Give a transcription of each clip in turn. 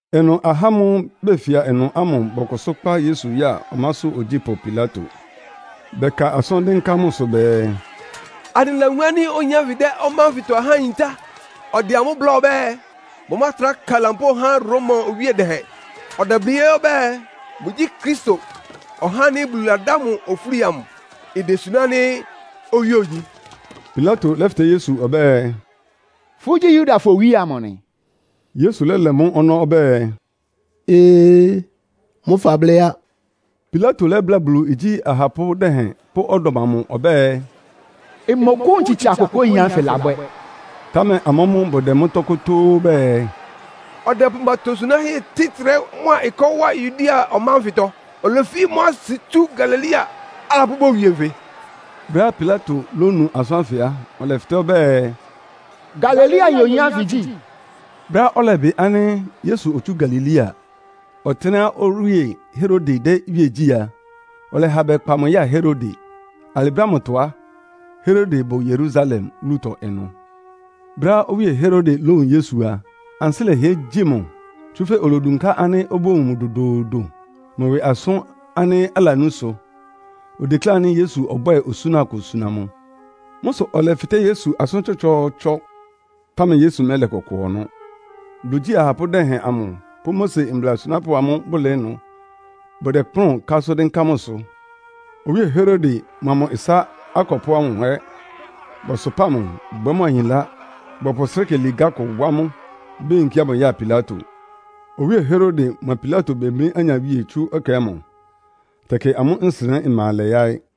Ɩnʋ ahá ámʋ́ʋ́ befia ɩnʋ ámʋ bɔkʋsʋ́ kpá Yesu ya ɔmásʋ́ ogyípʋ́ Pilato. Bɛka asʋ́n dɩ́nká mʋsʋ bɛɛ, “Anɩlawun ánɩ́ oyin ánfɩ dɛ́ ɔmá ánfɩtɔ ahá yintá. Ɔdɛ amʋ́ bláa ɔbɛ́ɛ, bʋmátra ka lampóo há Roma owíe dɛhɛn. Ɔdɛblɩ́ ɛ́ ɔbɛ́ɛ, mʋgyí Kristo, (ɔhá ánɩ́ Bulu ladá mʋ ofúli amʋ), idesuná ánɩ́ owíe ogyi.” Pilato lɛ́fɩtɛ́ Yesu ɔbɛ́ɛ, “Fʋ́gyí Yudafɔ owíe amʋ nɩ?” Yesu lɛ́lɛ mʋ́ ɔnɔ́ ɔbɛ́ɛ, “Ee, mʋ́ fablɩ́ á.” Pilato lɛ́bláa Bulu igyí ahapʋ́ dɛhɛn pʋ́ ɔdɔm amʋ ɔbɛ́ɛ, “Mmɔkʋ́wun tsitsa kʋkʋá oyin ánfɩ labwɛ́.” Támɛ amʋ́ mʋ́ bʋdɛ mʋ́tɔ́ kótóó bɛɛ, “Ɔdɛpʋ mʋ atosunáhɛ́ tɩ́ ɩtrɛ́ mʋ́a ɩkɔ́ wá Yudea ɔmá ánfɩtɔ. Olefi mʋ́ asɩ tsú Galilea, alapʋ́ bowie nfɩ.” Brɛ́á Pilato lónu asʋ́n ánfɩ á, ɔlɛfɩtɛ́ ɔbɛ́ɛ, “Galileayin oyin ánfɩ gyí?” Brɛ́á ɔlɛbɩ ánɩ́ Yesu otsú Galilea, ɔtɩ́nɛ́á owíe Herode dɛ́ iwíe gyí a, ɔlɛha bɛkpa mʋ ya Herode. Alɩ brɛ́ ámʋtɔ á, Herode bʋ Yerusalem wúlutɔ ɩnʋ. Brɛ́á owíe Herode lówun Yesu a, ansɩ́ lɛhɩɛ gyi mʋ. Tsúfɛ́ olodunká ánɩ́ obówun mʋ dodoodo, mʋ ɩwɩ asʋ́n ánɩ́ alanú sʋ. Odeklé ánɩ́ Yesu ɔbwɛ́ɛ osúna kʋ suna mʋ. Mʋ́ sʋ ɔlɛfɩtɛ́ Yesu asʋ́n tsɔtsɔɔtsɔ, támɛ Yesu mɛ́lɛ kʋkʋ ɔnɔ́. Bulu igyí ahapʋ́ dɛhɛn amʋ pʋ́ Mose mbla asunápʋ́ amʋ bʋlɩɩ́ ɩnʋ, bʋdɛkplʋ́n ka asʋ́n dɩ́nká mʋsʋ. Owíe Herode mʋa mʋ ɩsá akɔpʋ́ ámʋ ɛ́ bɔsʋpáa mʋ, bwɛ́ mʋ ahinlá. Bɔpʋ srɩ́kɩ ligá kʋ wá mʋ, beyinkía mʋ ya Pilato. Owíe Herode mʋa Pilato bemlí anyawíe tsú ɛkɛ ámʋ. Tɛkɩ amʋ́ nsɩnɛ́ ɩma alɛ yáɩ́.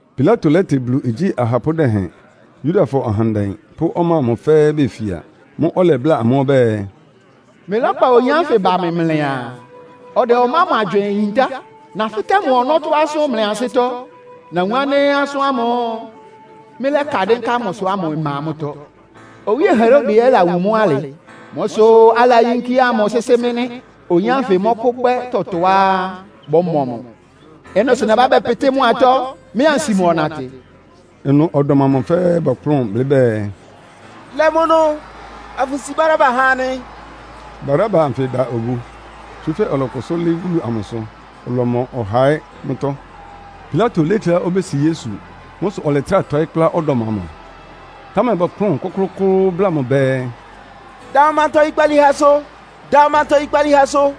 Pilato lɛ́tɩ Bulu igyí ahapʋ́ dɛhɛn, Yudafɔ ahandɛ pʋ́ ɔmá ámʋ fɛ́ɛ́ befia. Mʋ́ʋ́ ɔlɛbláa amʋ́ ɔbɛ́ɛ, “Mlɩlɛ́kpa oyin ánfɩ ba mɩ mlɩaa, ɔdɛ ɔmá ámʋ agywɩɩn yintá. Nafɩtɛ́ mʋ ɔnɔ́tɔ́ asʋ́n mlɩ ansɩ́tɔ́, nawun ánɩ́ asʋ́n ámʋ́ʋ́ mlɩlɛ́ka dɩ́nká mʋsʋ ámʋ ɩma mʋ́tɔ́. Owíe Herode ɛ́ lawun mʋ́ alɩ. Mʋ́ sʋ́ alayínkía mʋ sɩ́sɩ́ anɩ nɩ́. Oyin ánfɩ mɔ́kʋ́bwɛ́ tɔtɔá bɔ́mɔ mʋ. Ɩ́nɩ sʋ nɛ́ha bɛ́pɩtɩ́ mʋ atɔ́, mɩ́ ansi mʋ ɔnatɩ.” Ɩnʋ ɔdɔm amʋ fɛ́ɛ́ bɔkplʋ́n blɩ́ bɛɛ, “Lɛ mʋ ɩnʋ, afʋsi Baraba ha anɩ!” (Baraba anfɩ da obu, tsúfɛ́ ɔlɔkʋsʋ́ lɩ́ɩ́ wúlu amʋsʋ, ɔlɔmɔ ɔha ɛ́ mʋ́tɔ́.) Pilato lékléá obési Yesu. Mʋ́ sʋ ɔlɛtrá tɔɩ́ kplá ɔdɔm amʋ. Támɛ bɔkplʋ́n kʋ́klʋ́kʋ́ʋ́ bláa mʋ bɛɛ, “Da mʋ manta oyikpalíhɛsʋ! Da mʋ manta oyikpalíhɛsʋ!”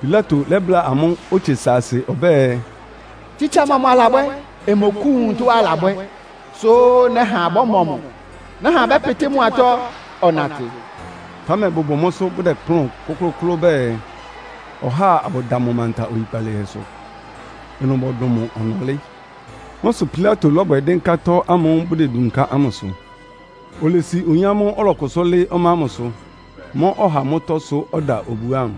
Pilato lɛ́bláa amʋ́ otse saasɩ ɔbɛ́ɛ, “Tsitsa mɔmʋ alabwɛ́? Mmɔkʋ́wun tɔ́á alabwɛ́, sʋ́ nɛ́ha bɔ́mɔ mʋ. Nɛ́ha abʋpɩtɩ mʋ atɔ́, ɔnatɩ.” Támɛ bʋbʋ mʋ́sʋ́ bʋdɛkplʋ́n kʋklʋ́kʋ́ʋ́ bɛɛ, ɔháa abʋda mʋ manta oyikpalíhɛsʋ. Ɩnʋ bɔdʋn mʋ ɔnɔlɩ́. Mʋ́ sʋ Pilato lɔ́bwɛ dɩ́nká tɔ́ ámʋ́ʋ́ bʋdedunká ámʋsʋ. Olesi oyin ámʋ́ʋ́ ɔlɔkʋsʋ́ lɩ́ɩ́ ɔmá ámʋsʋ, mɔ́ ɔha mʋ́tɔ́ sʋ́ ɔda obu ámʋ,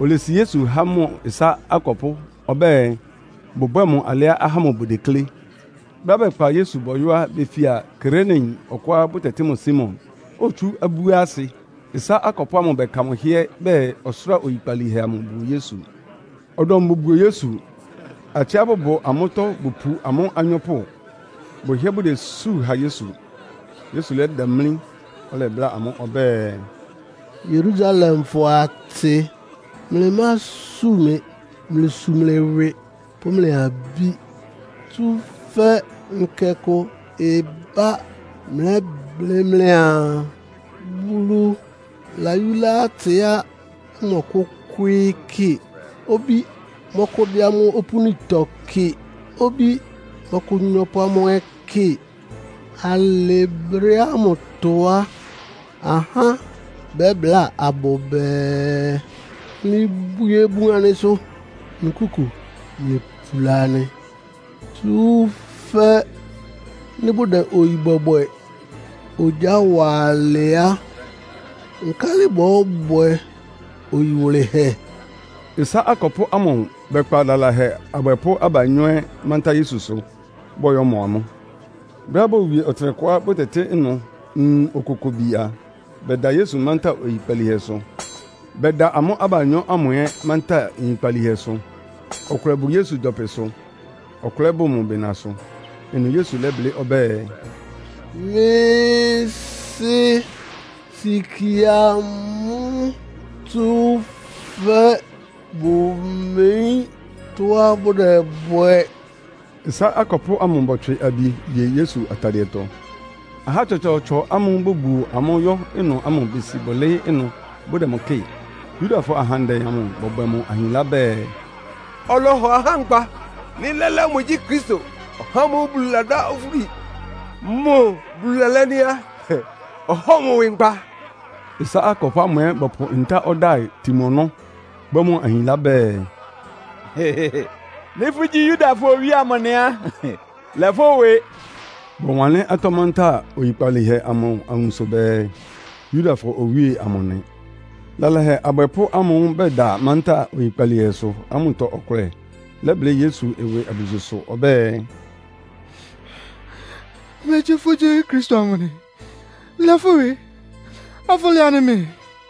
olesi Yesu há mʋ ɩsá akɔpʋ́ ɔbɛ́ɛ bʋbwɛ́ɛ mʋ alɩá ahá ámʋ bʋdeklé. Brɛ́á bɛkpa Yesu bɔyɔ́ á, befia Kireneyin ɔkʋá bʋtɛtɩ́ mʋ Simon. Otsú abúasɩ. Ɩsá akɔpʋ́ ámʋ bɛka mʋ hɩ́ɛ́ bɛɛ ɔsʋ́ra oyikpalíhɛ amʋ buo Yesu. Ɔdɔm bobuo Yesu. Atsɩá bʋbʋ amʋ́tɔ́ bʋpu amʋ́ anyɔ́pʋ, bʋhɩ́ɛ́ bʋdesú ha Yesu. Yesu lɛ́damlí, ɔlɛbláa amʋ́ ɔbɛ́ɛ, “Yerusalemfɔ atsɩ, mlɩmásu mɩ. Mlɩsu mlɩ ɩwɩ pʋ́ mlɩ abí. Tsúfɛ́ nkɛ kʋ ɩbá mlɛ́blɩ́ mlɩaa, ‘Bulu layúlá atsɩá bʋmɔkʋ́kwɩ́ɩ́ kɩ, obí mɔ́kʋ́dɩ́ amʋ́ opúnitɔ kɩ, obí mɔ́kʋ́nyɔ́pʋ́ amʋ́ ɛ́ kɩ.’ Alɩ brɛ́ ámʋtɔ á, ahá bɛ́bláa abʋ bɛɛ, ‘Mlɩbwie bun anɩsʋ. Nkúku, mlɩpula anɩ.’ Tsúfɛ́ nɩ́ bʋdɛ oyi bɔbwɛ ogyá wa alɩ á, nkálɩ bɔ́bwɛ oyi wʋlɩhɛ?” Ɩsá akɔpʋ́ ámʋ bɛkpa lalahɛ abwɛpʋ́ abanyɔ́ ɛ́ mántá Yesusʋ, bɔyɔ́mɔ amʋ́. Brɛ́á bowie ɔtɩnɛkʋá bʋtɛtɩ́ ɩnʋ “Nwun Okokobi” a, bɛda Yesu mántá oyikpalíhɛsʋ. Bɛda amʋ́ abanyɔ́ ámʋ ɛ́ mántá nyikpalíhɛsʋ. Ɔkʋlɛ bʋ Yesu gyɔpɩsʋ, ɔkʋlɛ ɛ́ bʋ mʋ bɩnasʋ. Ɩnʋ Yesu lɛ́blɩ́ ɔbɛ́ɛ, “Mɩ́ Sɩ́, sikie amʋ́, tsúfɛ́ bʋmeyín tɔ́á bʋdɛbwɛ.” Ɩsá akɔpʋ́ ámʋ bɔtswɩ abi ye Yesu atadɩɛtɔ. Ahá tsɔtsɔɔtsɔ ámʋ́ʋ́ bobuo amʋ́ yɔ́ ɩnʋ ámʋ besi bʋlɩɩ́ ɩnʋ bʋdɛ mʋ kɩ́ɩ. Yudafɔ ahandɛ amʋ bɔbwɛ mʋ ahinlá bɛɛ, “Ɔlɔhɔ ahá nkpa. Nɩ́ lɛ́lɛ́ mʋgyí Kristo, (ɔhá ámʋ́ʋ́ Bulu ladá mʋ ofúli), mʋ Bulu lalɛ́ nɩ́ á, ɔhɔ́ɔ mʋ ɩwɩ nkpa!” Ɩsá akɔpʋ́ ámʋ ɛ́ bɔpʋ ntá ɔdáɩ tin mʋ ɔnɔ́, bwɛ́ mʋ ahinlá bɛɛ, “Nɩ́ fʋ́gyí Yudafɔ owíe amʋ nɩ á, lɛ fʋ́ ɩwɩ!” Bɔwanlɩ́n atɔ́ mántá oyikpalíhɛ amʋ awunso bɛɛ, “Yudafɔ Owíe amʋ nɩ.” Lalahɛ abwɛpʋ́ ámʋ́ʋ́ bɛda mántá oyikpalíhɛsʋ ámʋtɔ ɔkʋlɛ lɛ́blɩ́ Yesu ɩwɩ abususʋ ɔbɛ́ɛ, “Megyí fʋ́gyí Kristo amʋ nɩ? Lɛ fʋ́ ɩwɩ, afʋlɛ anɩ mɛɛ!”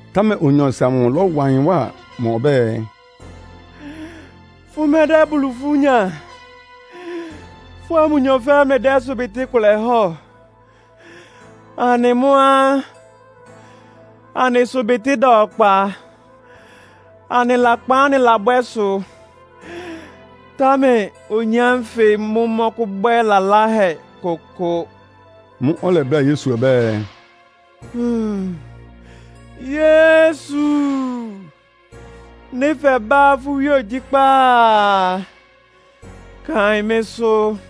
Támɛ onyɔɔsɩ amʋ lɔ́wa ɩyɩn wá mʋ ɔbɛ́ɛ, “Fʋmɛdɛ́ Bulu ifú nya! Fʋ́a mʋnyɔ fɛ́ɛ́ dɛ́ ɩsʋbɩtɩ́ kʋlɛ hɔ́ɔ. Anɩ mʋ́ á, anɩ ɩsʋbɩtɩ́ ɩda ɔkpa, anɩ lakpan ánɩ́ anɩlɔ́bwɛ sʋ. Támɛ oyin ánfɩ mʋ́ mɔ́kʋ́bwɛ́ laláhɛ kʋkʋ.” Mʋ́ʋ́ ɔlɛbláa Yesu ɔbɛ́ɛ, “Yesu, nɩ́ fɛbá fʋ́ iwíe ogyíkpá a, kaɩn mɩ́sʋ́!”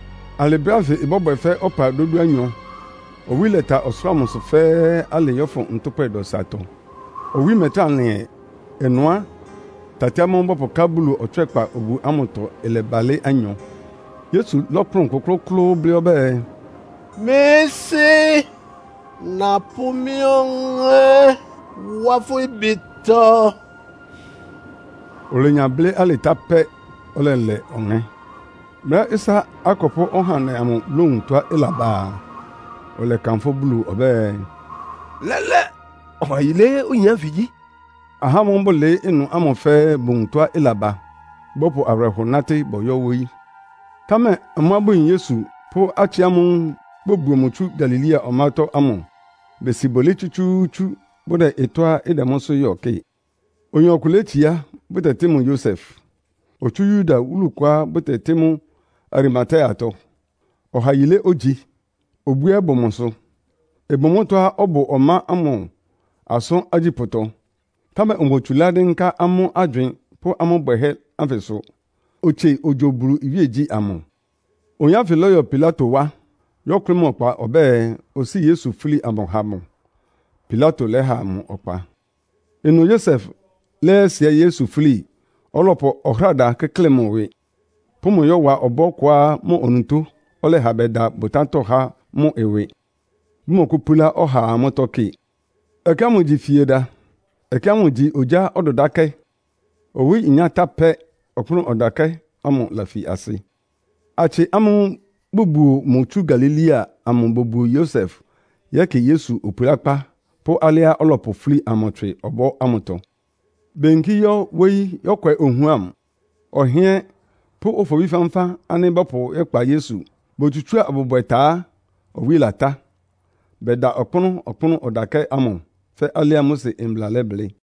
Alɩ brɛ́ ánfɩ ɩbɔ́bwɛ fɛ́ ɔpa dódúanyɔ. Owí lɛta ɔsʋlʋ́ʋ amʋsʋ fɛ́ɛ́ alɩɩ yɔ́fʋn ntʋ́pwɛ dɔsatɔ. Owí mɛtrá lɩn ɛ. Ɩnʋ á, tati ámʋ́ʋ́ bɔpʋká Bulu Ɔtswɛ́kpa obu ámʋtɔ ɩlɛbalɩ́ anyɔ. Yesu lɔ́kplʋn kʋ́klʋ́kʋ́ʋ́ blɩ́ ɔbɛ́ɛ, “Mɩ́ Sɩ́, napʋ́ mɩ́ ɔŋɛ́ wá fʋ́ ɩbɩtɔ.” Olenya blɩ́ alɩ tá pɛ́, ɔlɛlɛ ɔŋɛ́. Brɛ́á ɩsá akɔpʋ́ ɔhandɛ amʋ lówun tɔ́á ɩlaba a, ɔlɛkanfʋ́ Bulu ɔbɛ́ɛ, “Lɛ́lɛ́, ɔha yilé oyin ánfɩ gyí.” Ahá ámʋ́ʋ́ bʋlɩɩ́ ɩnʋ ámʋ fɛ́ɛ́ bowun tɔ́á ɩlaba, bɔpʋ awɩrɛhɔ nátɩ́ bɔyɔ́ wóyí. Támɛ amʋ́á bʋyin Yesu pʋ́ atsɩ ámʋ́ʋ́ bobuo mʋ tsú Galilea ɔmátɔ́ ámʋ besi bʋlɩɩ́ tsútsúútsú bʋdɛ ɩtɔ́á ɩdɛ mʋ́sʋ́ yɔ kɩ́ɩ. Oyin ɔkʋ létsiá, bʋtɛtɩ́ mʋ Yosef. Otsú Yuda wúlu kʋá bʋtɛtɩ́ mʋ́ Arimateatɔ. Ɔha yilé ogyi, obú ɛ́ bʋ mʋsʋ. Ɩbʋ mʋ́tɔ́á ɔbʋ ɔmá ámʋ asʋ́n agyípʋ́tɔ, támɛ omotsulá dɩ́nká amʋ́ agywɩɩn pʋ́ amʋ́ bwɛhɛ́ ánfɩsʋ. Otsie ogyo Bulu iwíegyí ámʋ. Oyin ánfɩ lɔ́yɔ Pilato wá, yɔ́kʋlɩ́ mʋ ɔkpa ɔbɛ́ɛ, osíi Yesu fúli amʋ ha mʋ. Pilato lɛ́ha mʋ ɔkpa. Ɩnʋ Yosef lɛ́yɛsɩɛɩ́ Yesu fúli, ɔlɔpʋ ɔhráda kɩ́klɩ mʋ ɩwɩ, pʋ́ mʋ yɔ́wa ɔbɔ́ kʋá mʋ onutó ɔlɛha bɛda bʋtátɔ́ há mʋ ɩwɩ, bʋmɔkʋ́púlá ɔhaa mʋ́tɔ́ kɩ. Ɛkɛ ámʋ igyi Fieda. Ɛkɛ ámʋ igyi ogyá ɔdʋdákɛ́. Owí inyá tá pɛ́, ɔkpʋ́nʋ́ ɔdakɛ́ ámʋ lafi asɩ. Atsɩ ámʋ́ʋ́ bʋbuo mʋ tsú Galilea amʋ bobuo Yosef yɛ́kɩ Yesu opulákpá pʋ́ alɩá ɔlɔpʋ fúli amʋ tswɩ ɔbɔ́ ámʋtɔ. Beyinkí yɔ́ wóyí yɔ́kwɛ ohuam, ɔhɩ́ɛ́n pʋ́ ofobí fánfán ánɩ́ bɔ́pʋ yɛ́kpa Yesu. Botsutsúa abʋbwɛ ta á, owí latá, bɛda ɔkpʋ́nʋ́ ɔkpʋ́nʋ́ ɔdakɛ́ ámʋ fɛ́ alɩá Mose Mbla lɛblɩ́.